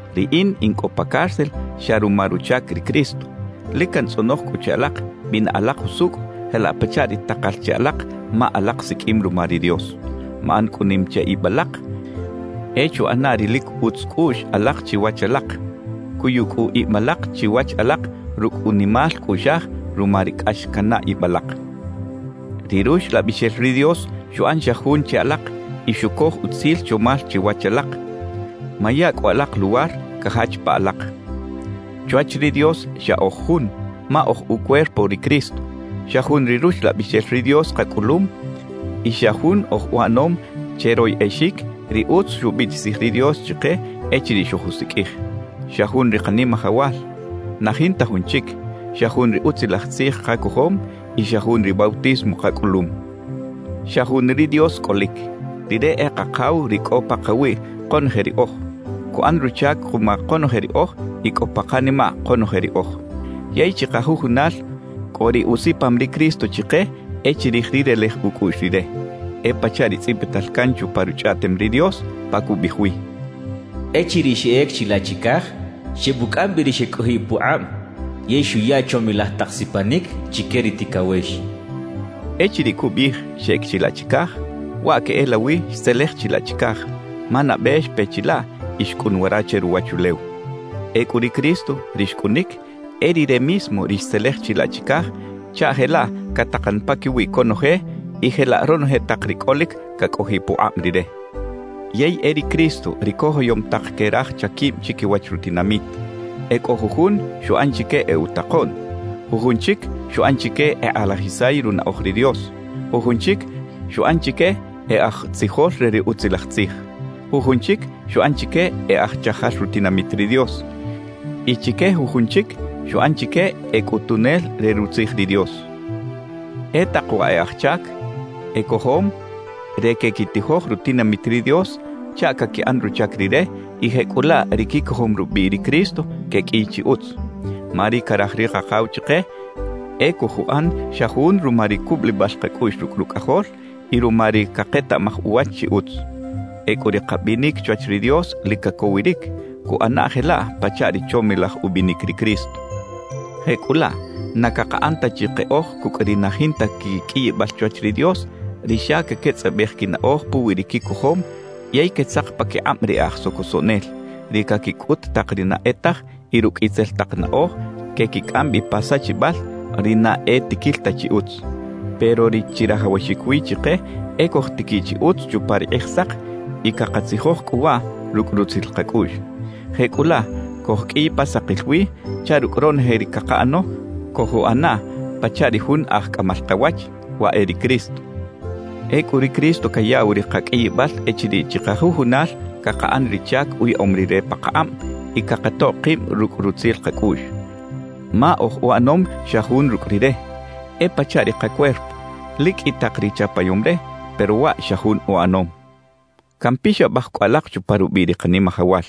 Riꞌin in cꞌo pa cárcel xa ruma ruchac ri Cristo; lic cantzꞌonoj cꞌu che alak bina alak jusucꞌ jelaꞌ pachaꞌ ri takal che alak ma alak siqꞌuim ruma ri Dios. Maꞌan cꞌu nim che ib alak; e chuꞌana ri lic utz cꞌuꞌx alak chiwach alak. Cuyu cꞌu ib alak chiwach alak rucꞌ unimal cꞌuꞌxaj ruma ri cꞌax canaꞌ ib alak. Ri Ruxlabixel ri Dios xuꞌan xa jun che alak y xucoj utzil chomal chiwach alak; maya cꞌu alak luwar cajach pa alak. Chwach ri Dios xa oj jun ma oj ucuerpo ri Cristo, xa jun ri Ruxlabixel ri Dios kacꞌulum y xa jun oj uꞌanom che royꞌexic ri utz xubiꞌtisij ri Dios chike echiriꞌ xojusiqꞌuij. Xa jun ri Kanimajawal, na jinta jun chic; xa jun ri Utzilaj Tzij kacojom y xa jun ri bautismo kacꞌulum. Xa jun ri Dios cꞌolic; Rire e Kakaw ri cꞌo pakawiꞌ konoje riꞌoj, cuꞌan ruchac kuma konoje riꞌoj y cꞌo pa kanimaꞌ konoje riꞌoj. Yey chikajujunal cꞌo ri usipam ri Cristo chike e chirij ri relej ucꞌuꞌx Rire. E pachaꞌ ri tzꞌibital can chupa Ruchꞌaꞌtem ri Dios pa cubiꞌij wi: Echiriꞌ xeꞌec chilaꞌ chicaj, xebucꞌam bi ri xecꞌojiꞌ pukꞌab yey xuya chomilaj tak sipanic chique ri ticawex. Echiriꞌ cubiꞌij «xeꞌec chilaꞌ chicaj», waꞌ queꞌelawi xtzelej chilaꞌ chicaj, ma nabe xpe chilaꞌ y xcꞌun wara che ruwachulew. Ecꞌu ri Cristo, ri xcꞌunic, e Rire mismo ri xtzelej chilaꞌ chicaj chaꞌ jelaꞌ catakan paquiwi conoje y jelaꞌ ronoje tak ri cꞌolic cacꞌojiꞌ pukꞌab Rire. Yey e ri Cristo ri cojoyom tak que raj chaquib chiquiwach rutinamit. E cꞌo jujun xuꞌan chique e utakoꞌn; jujun chic xuꞌan chique ekꞌalajisay runaꞌoj ri Dios. Jujun chic xuꞌan chique e aj tzijol re ri Utzilaj Tzij. Jujun chic xuꞌan chique e aj chajal rutinamit ri Dios y chique jujun chic xuꞌan chique e cꞌutunel re Rutzij ri Dios. E tak wa e aj chac ecojom re quequitijoj rutinamit ri Dios chaꞌ caquiꞌan ruchac Rire y jecꞌulaꞌ ri quicojom rubiꞌ ri Cristo queqꞌuiy chi utz. Ma ri caraj ri Kakaw chike e cojuꞌan xa jun ruma ri cubulibal kacꞌuꞌx rucꞌ Rucꞌajol y ruma ri caketaꞌmaj uwach chi utz. Ecꞌu ri kabinic chwach ri Dios lic cacowiric, cuꞌana jelaꞌ pachaꞌ ri chomilaj ubinic ri Cristo. Jecꞌulaꞌ na cakaꞌan ta chi keꞌoj cucꞌ ri na jinta quiqꞌuiyibal chwach ri Dios, ri xa caquetzꞌabej quinaꞌoj puwi ri quicojom yey quetzak paquikꞌab ri e aj socosoꞌnel, ri caquicꞌut tak ri na e taj y rucꞌ itzel tak naꞌoj quequicꞌam bi pa sachibal ri na e tiquil ta chi utz. Pero ri chirajawaxic wi chike e cojtiquiꞌ chi utz chupa ri Kꞌijsak y cakatzijoj cꞌu waꞌ rucꞌ rutzil kacꞌuꞌx. Jecꞌulaꞌ cojqꞌuiy pa sakil wi chaꞌ rucꞌ ronoje ri cakaꞌano cojuꞌana pachaꞌ ri Jun Aj Cꞌamal Kawach, waꞌ e ri Cristo. Ecꞌu ri Cristo cayaꞌw ri kaqꞌuiyibal echiriꞌ chikajujunal cakaꞌan ri chac uyaꞌom Rire pakakꞌab y cakatoꞌ kib rucꞌ rutzil kacꞌuꞌx. Ma oj uꞌanom xa jun rucꞌ Rire; e pachaꞌ ri kacuerpo, lic qꞌui tak ri chapayom re, pero waꞌ xa jun uꞌanom. Campixabaj cꞌu alak chupa rubiꞌ ri Kanimajawal: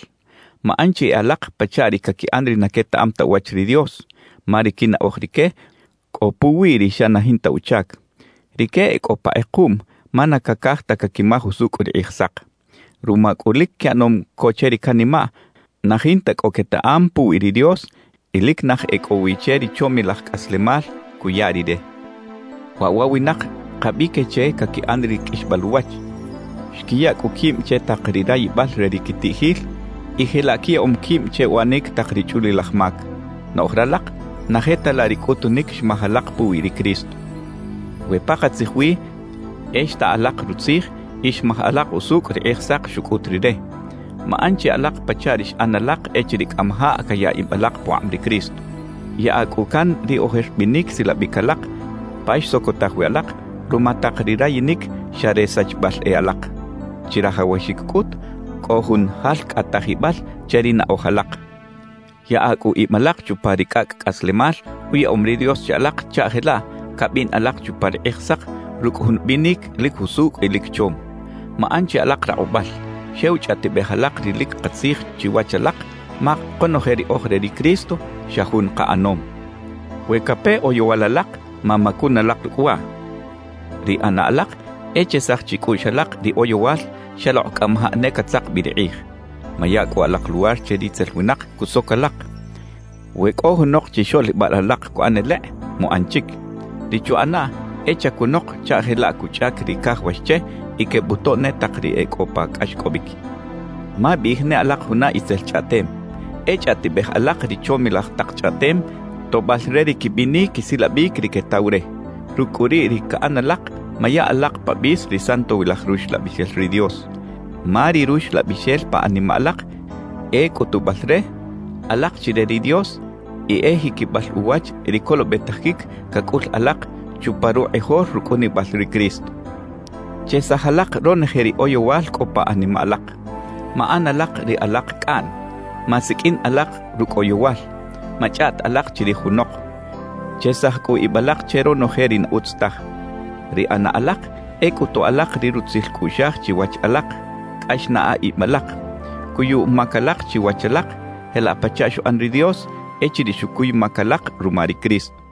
Maꞌan chi e alak pachaꞌ ri caquiꞌan ri na quetaꞌam ta uwach ri Dios, ma ri quinaꞌoj rique cꞌo puwi ri xa na jinta uchac. Rique e cꞌo pa kꞌekuꞌm ma na cacaj ta caquimaj usucꞌ ri Kꞌijsak. Ruma cꞌu lic quiꞌanom co che ri canimaꞌ, na jinta cꞌo quetaꞌam puwi ri Dios y lic naj e cꞌo wi che ri chomilaj cꞌaslemal cuya Rire. Waꞌ wa winak kabi que che caquiꞌan ri qꞌuixbal uwach; xquiya cꞌu quib che tak ri rayibal re ri quitiꞌjil y jelaꞌ quiyaꞌom quib che uꞌanic tak ri chꞌulilaj mac. Noꞌj ralak na je ta laꞌ ri cꞌutunic xmaj alak puwi ri Cristo, we pakatzij wi e xta alak rutzij y xmaj alak usucꞌ ri Kꞌijsak xucꞌut Rire. Maꞌan chi alak pachaꞌ ri xꞌan alak echiriꞌ cꞌamajaꞌ caya ib alak pukꞌab ri Cristo. Yaꞌa cꞌu can ri ojer binic silabic alak pa xsocotaj wi alak ruma tak ri rayinic xa re sachibal e alak. Chirajawaxic cꞌut cꞌo jun jalcꞌatajibal che ri naꞌoj alak. Yaꞌa cꞌu ib alak chupa ri cꞌacꞌ cꞌaslemal uyaꞌom ri Dios che alak chaꞌ jelaꞌ cabin alak chupa ri Kꞌijsak rucꞌ jun binic lic jusucꞌ y lic chom. Maꞌan chi alak rakꞌubal, xew chꞌaꞌtibej alak ri lic katzij chiwach alak, ma konoje ri oj re ri Cristo, xa jun kaꞌanom. We cape oyowal alak, mamacun alak rucꞌ waꞌ; ri ꞌana alak e chesaj chicꞌuꞌx alak ri oyowal xalokꞌ cꞌamajaꞌ ne catzak bi ri kꞌij. Maya cꞌu alak luwar che ritzel winak cusoc alak. We cꞌo junok chixoꞌlibal alak cuꞌan elekꞌ, muꞌan chic. Ri chuꞌanaꞌ e chacunok chaꞌ jelaꞌ cuchꞌac ri cajawax che y quebutoꞌ ne tak ri e cꞌo pa cꞌaxcꞌobic. Mabiꞌij ne alak juna itzel chꞌaꞌtem; e chꞌaꞌtibej alak ri chomilaj tak chꞌaꞌtem, toꞌbal re ri quibinic quisilabic ri quetaw re. Rucꞌ cꞌu riꞌ ri caꞌan alak, maya alak pa bis ri Santowilaj Ruxlabixel ri Dios. Ma ri Ruxlabixel pa animaꞌ alak e cꞌutubal re, alak chi re ri Dios y e jiquibal uwach ri colobetajic cacꞌul alak chupa rukꞌijol rucꞌunibal ri Cristo. Chesaj alak ronoje ri oyowal cꞌo pa animaꞌ alak. Maꞌan alak ri alak cꞌaꞌn. Masiqꞌuin alak rucꞌ oyowal. Machꞌaꞌt alak chirij junok. Chesaj cꞌu ib alak che ronoje ri na utz taj. Ri ꞌana alak e cꞌutu alak ri rutzil cꞌuꞌxaj chiwach alak, cꞌax naꞌa ib alak. Cuyu mac alak chiwach alak jelaꞌ pachaꞌ xuꞌan ri Dios echiriꞌ xucuy mac alak ruma ri Cristo.